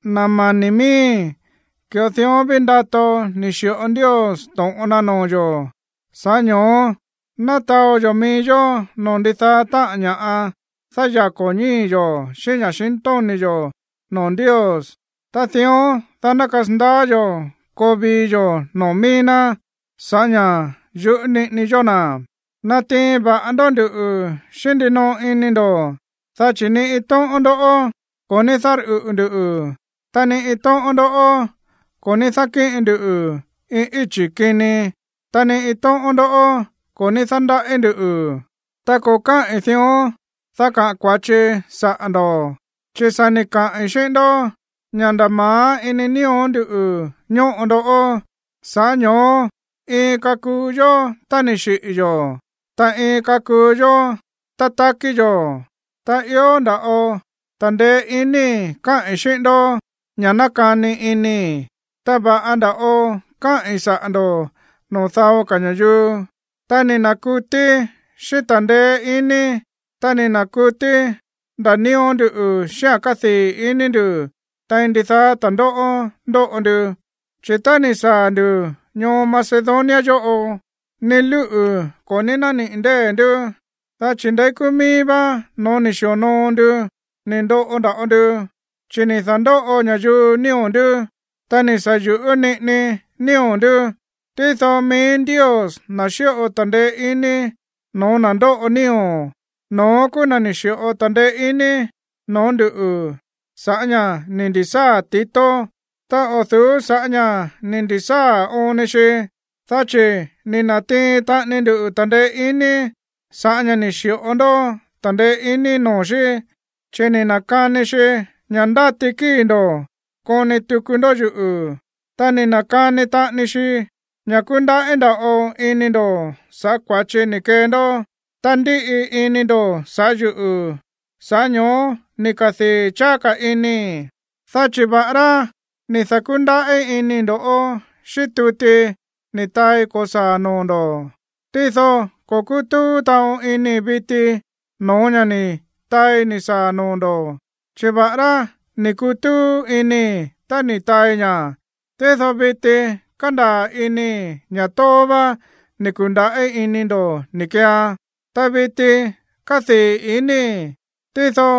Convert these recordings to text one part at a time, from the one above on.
Na̱ mani̱ miíi̱, ki̱ꞌo dión ví ndato ni̱ xi̱ꞌo Ndios to̱ꞌon na noo̱ yo̱, sa̱ꞌá ño̱ó ná taó yo̱ mií yó noo̱ ndidaá táꞌa̱n ña̱ dáyako̱ ñíi̱ yo̱ xíꞌín ña̱xintóni̱ yo̱ noo̱ Ndios. Ta dión, dá ná kasandaá yo̱ koo vii yo̱ noo̱ mií ná sa̱ꞌá ña̱ yuꞌú niꞌini yó na̱. Natiin va̱ꞌa ndó nduꞌu̱ xíꞌín ndinoꞌo ini ndo̱, dá chi̱ ni iin tóꞌón ndó ko̱ ní dárꞌuꞌu̱ ndu̱, ta ni iin tóꞌón ndó ko̱ ní dákíꞌin ndu iin íchi̱ kini, ta ni iin tóꞌón ndó ko̱ ní dándaꞌí ndu̱. Ta ko̱ káꞌi̱n dión, dá kaꞌa̱n kua̱chii saꞌa̱ ndo̱, chi̱ sa̱ ni̱ kaꞌi̱n xíꞌín ndó ña̱ nda̱ ma̱á ini nío̱ ndú ñóꞌo ndoꞌó. Sa̱ꞌá ño̱ó iin kakuu yó tá ni̱ xiꞌi̱ yo̱, ta iin kakuu yó tá takí yo̱. Ta ió nda̱ꞌo ta̱ndeé iníi̱ káꞌi̱n xíꞌín ndó ña̱ nákani inii̱, ta va̱ꞌa nda̱ꞌo káꞌi̱n saꞌa̱ ndo̱ noo̱ dao ka̱ ña̱yuu. Ta ni̱ na̱kutíí xíꞌín ta̱ndeé iní, ta ni̱ na̱kutí ndaa̱ nío̱ ndú xíꞌa̱n kádii̱ ini ndu̱ tein ndidaá ta̱ndóꞌó ndóꞌo ndu. Chi̱ tá ni̱ ka̱sáa̱ ndu̱ Macedonia yóꞌo, ni lúꞌu̱ ko̱ ní nániꞌi̱ ndée̱ ndú, dá chi̱ ndeí kúú míí vá no̱ó ni̱ xi̱onoo ndu ni̱ ndoꞌo nda̱ꞌo ndu, chi̱ ni̱ da̱ndóꞌo ña̱yuu nío̱ ndú, ta ni̱ sa̱ yu̱ꞌú niꞌini nío̱ ndú. Tído mií Ndios, na̱ xíꞌo ta̱ndeé iní no̱ó na̱ ndóꞌo nío̱, no̱ón kúú na̱ ni̱ xi̱ꞌo ta̱ndeé iní no̱ó nduꞌu̱ sa̱ꞌá ña̱ ni̱ ndi̱sáa̱ Tito. Ta o̱ du̱ú sa̱ꞌá ña̱ ni̱ ndu̱sáa̱ oon ni xi, dá chi̱ ni̱ na̱tiin taꞌani ndu ta̱ndeé iní sa̱ꞌá ña̱ ni̱ xi̱ꞌo ndó ta̱ndeé iní noo̱ xí, chi̱ ni̱ na̱kani xi ña̱ ndáti kíi̱ ndo̱ koni tuku ndó yuꞌu̱, ta ni̱ na̱kani taꞌani xi ña̱ kúndaꞌí nda̱ꞌo ini ndo̱ sa̱ꞌá kua̱chi ni̱ kee ndó, ta ndíꞌi ini ndo̱ sa̱ꞌá yuꞌu̱. Sa̱ꞌá ño̱ó ni̱ kadii̱ cháá ka̱ inii̱. Dá chi̱ va̱ꞌará ni̱ da̱kúndaꞌí inii̱ ndo̱ꞌó xíꞌín tuti ni̱ taai ko̱saa̱ noo̱ ndo̱, tído ko̱ kútúú taꞌon inii̱ viti no̱ó ña̱ ni taai ni̱ saa̱ noo̱ ndo̱. Chi̱ va̱ꞌará ni̱ kutúú inii̱ tá ni̱ taai ña̱, tído viti kándaa̱ inii̱ ña̱ tóó vá ni̱ ku̱ndaꞌí ini ndo̱ ni̱ keean. Ta viti kádii̱ inii̱, tído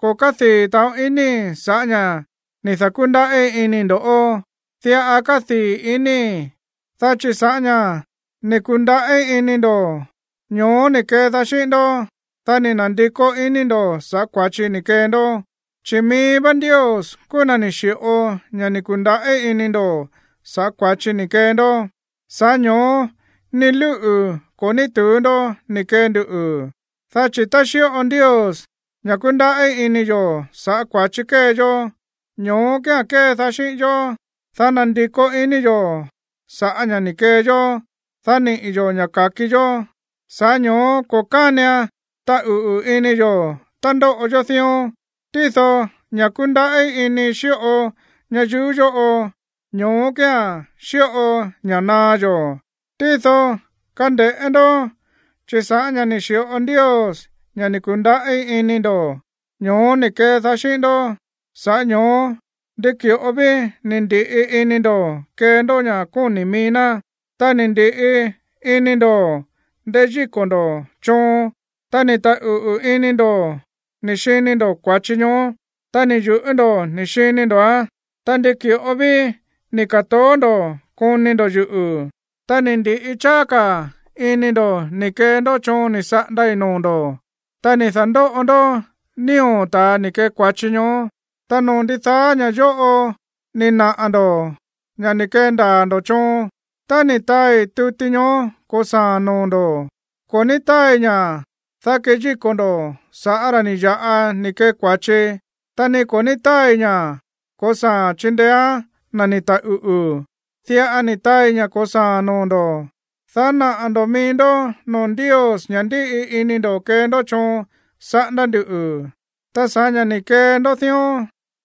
ko̱ kádii̱ taꞌon inii̱ sa̱ꞌá ña̱ ni̱ da̱kúndaꞌí iníi̱ ndó. Diꞌa kádii̱ inii̱, dá chi̱ sa̱ꞌá ña̱ ni̱ ku̱ndaꞌí iní ndo̱, ño̱ó ni̱ kedaá xíꞌín ndó, dá ni̱ na̱ndikó iní ndo̱ sa̱ꞌá kua̱chi ni̱ kee ndó. Chi̱ mií vá Ndios kúú na̱ ni̱ xi̱ꞌo ña̱ ni̱ ku̱ndaꞌí iní ndo̱ sa̱ꞌá kua̱chi ni̱ kee ndó. Sa̱ꞌá ño̱ó ni lúꞌu̱ ko̱ ní tu̱ú ndó ni̱ kee ndu. Dá chi̱ tá xíꞌo Ndios ña̱ kúndaꞌí iní yo̱ sa̱ꞌá kua̱chi kée yó, ño̱ó kía̱n kédaá xíꞌín yó, dá nandikó iní yo̱ sa̱ꞌá ña̱ ni̱ kee yó, dá niꞌi̱ yo̱ ña̱ ka̱ki yó. Sa̱ꞌá ño̱ó ko̱ kánian taꞌuꞌu̱ ini yo̱ tá ndóꞌo yó dión. Tído ña̱ kúndaꞌí ini xíꞌo ñayuú yóꞌo, ño̱ó kía̱n xíꞌo ña̱ naá yó. Tído kande̱ꞌé ndó, chi̱ sa̱ꞌá ña̱ ni̱ xi̱ꞌo Ndios ña̱ ni̱ ku̱ndaꞌí iní ndo̱, ño̱ó ni̱ kedaá xíꞌín ndó, sa̱ꞌá ño̱ó ndi ki̱ꞌo ví ni̱ ndi̱ꞌi ini ndo̱ kee ndó ña̱ kóni̱ mií ná, ta ni̱ ndi̱ꞌi ini ndo̱ ndeyíko̱ ndo̱ choon, ta ni̱ taꞌuꞌu̱ ini ndo̱ ni̱ xini ndo̱ kua̱chi ñoó, ta ni̱ yu̱ꞌú ndo̱ ni̱ xini ndo̱án, ta ndi ki̱ꞌo ví ni̱ ka̱toó ndo̱ koni ndo̱ yuꞌu̱, ta ni̱ ndi̱ꞌi cháá ka̱ ini ndo̱ ni̱ kee ndó choon ni̱ saꞌandai̱ noo̱ ndo̱, ta ni̱ da̱ndóꞌo ndó nío̱ ta̱a ni̱ kee kua̱chi ñoó. Ta noo̱ ndidaá ña̱ yóꞌo ni̱ naꞌa̱ ndo̱ ña̱ ni̱ kendaa̱ ndo̱ choon. Tá ni̱ taai tuti ñoó ko̱saa̱a̱n noo̱ ndo̱, ko̱ ní táai ña̱, dá keyíko̱ ndo̱ sa̱ꞌá ra̱ ni̱ ya̱ꞌa ni̱ kee kua̱chi, ta ni ko̱ ní táai ña̱ ko̱saa̱a̱n chindeéán na̱ ni̱ taꞌuꞌu̱. Diꞌa ni̱ taai ña̱ ko̱saa̱a̱n noo̱ ndo̱, dá naꞌa̱ ndo̱ mií ndó noo̱ Ndios ña̱ ndíꞌi ini ndó kee ndó choon saꞌándá ndu̱. Ta sa̱ꞌá ña̱ ni̱ kee ndó dión,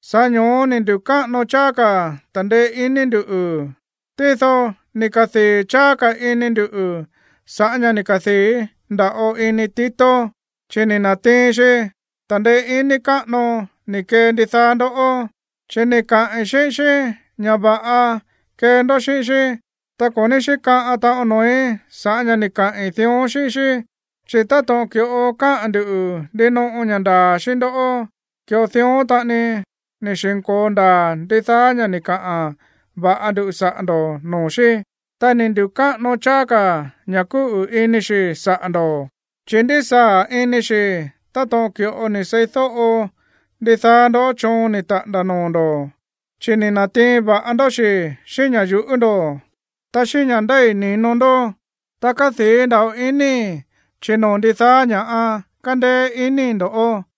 sa̱ꞌá ño̱ó ni̱ ndu̱káꞌano cháá ka̱ ta̱ndeé iní ndu̱. Tído ni̱ kadii̱ cháá ka̱ ini ndu̱ sa̱ꞌá ña̱ ni̱ kadii̱ nda̱ꞌo ini Tito, chi̱ ni̱ na̱tiin xi ta̱ndeé iní káꞌano ni̱ kee ndidaá ndoꞌó. Chi̱ ni̱ kaꞌi̱n xíꞌín xí ña̱ va̱ꞌa kee ndó xíꞌín xí, ta ko̱ ní xíkaꞌan taꞌon noo̱í sa̱ꞌá ña̱ ni̱ kaꞌi̱n dión xíꞌín xí. Chi̱ táto̱ꞌon ki̱ꞌo káꞌa̱n ndu̱ ndinoꞌo ña̱ ndaa̱ xíꞌín ndó, ki̱ꞌo dión taꞌani ni̱ xi̱nko̱o ndaa̱ ndidaá ña̱ ni̱ kaꞌa̱n va̱ꞌa ndu saꞌa̱ ndo̱ noo̱ xí. Ta ni̱ ndu̱káꞌano cháá ka̱ ña̱ kúꞌu̱ ini xi̱ saꞌa̱ ndo̱, chi̱ ndísaa̱ ini xi̱ táto̱ꞌon ki̱ꞌo ni̱ seídóꞌo ndidaá ndó choon ni̱ taꞌa̱nda̱ noo̱ ndo̱, chi̱ ni̱ na̱tiin va̱ꞌa ndó xi̱ xíꞌín ña̱ yuꞌú ndo̱, ta xíꞌín ña̱ ndéi̱ ni̱no ndó. Ta kádii̱ nda̱ꞌo inii̱, chi̱ noo̱ ndidaá ña̱ꞌa kándéé inii̱ ndo̱ꞌó.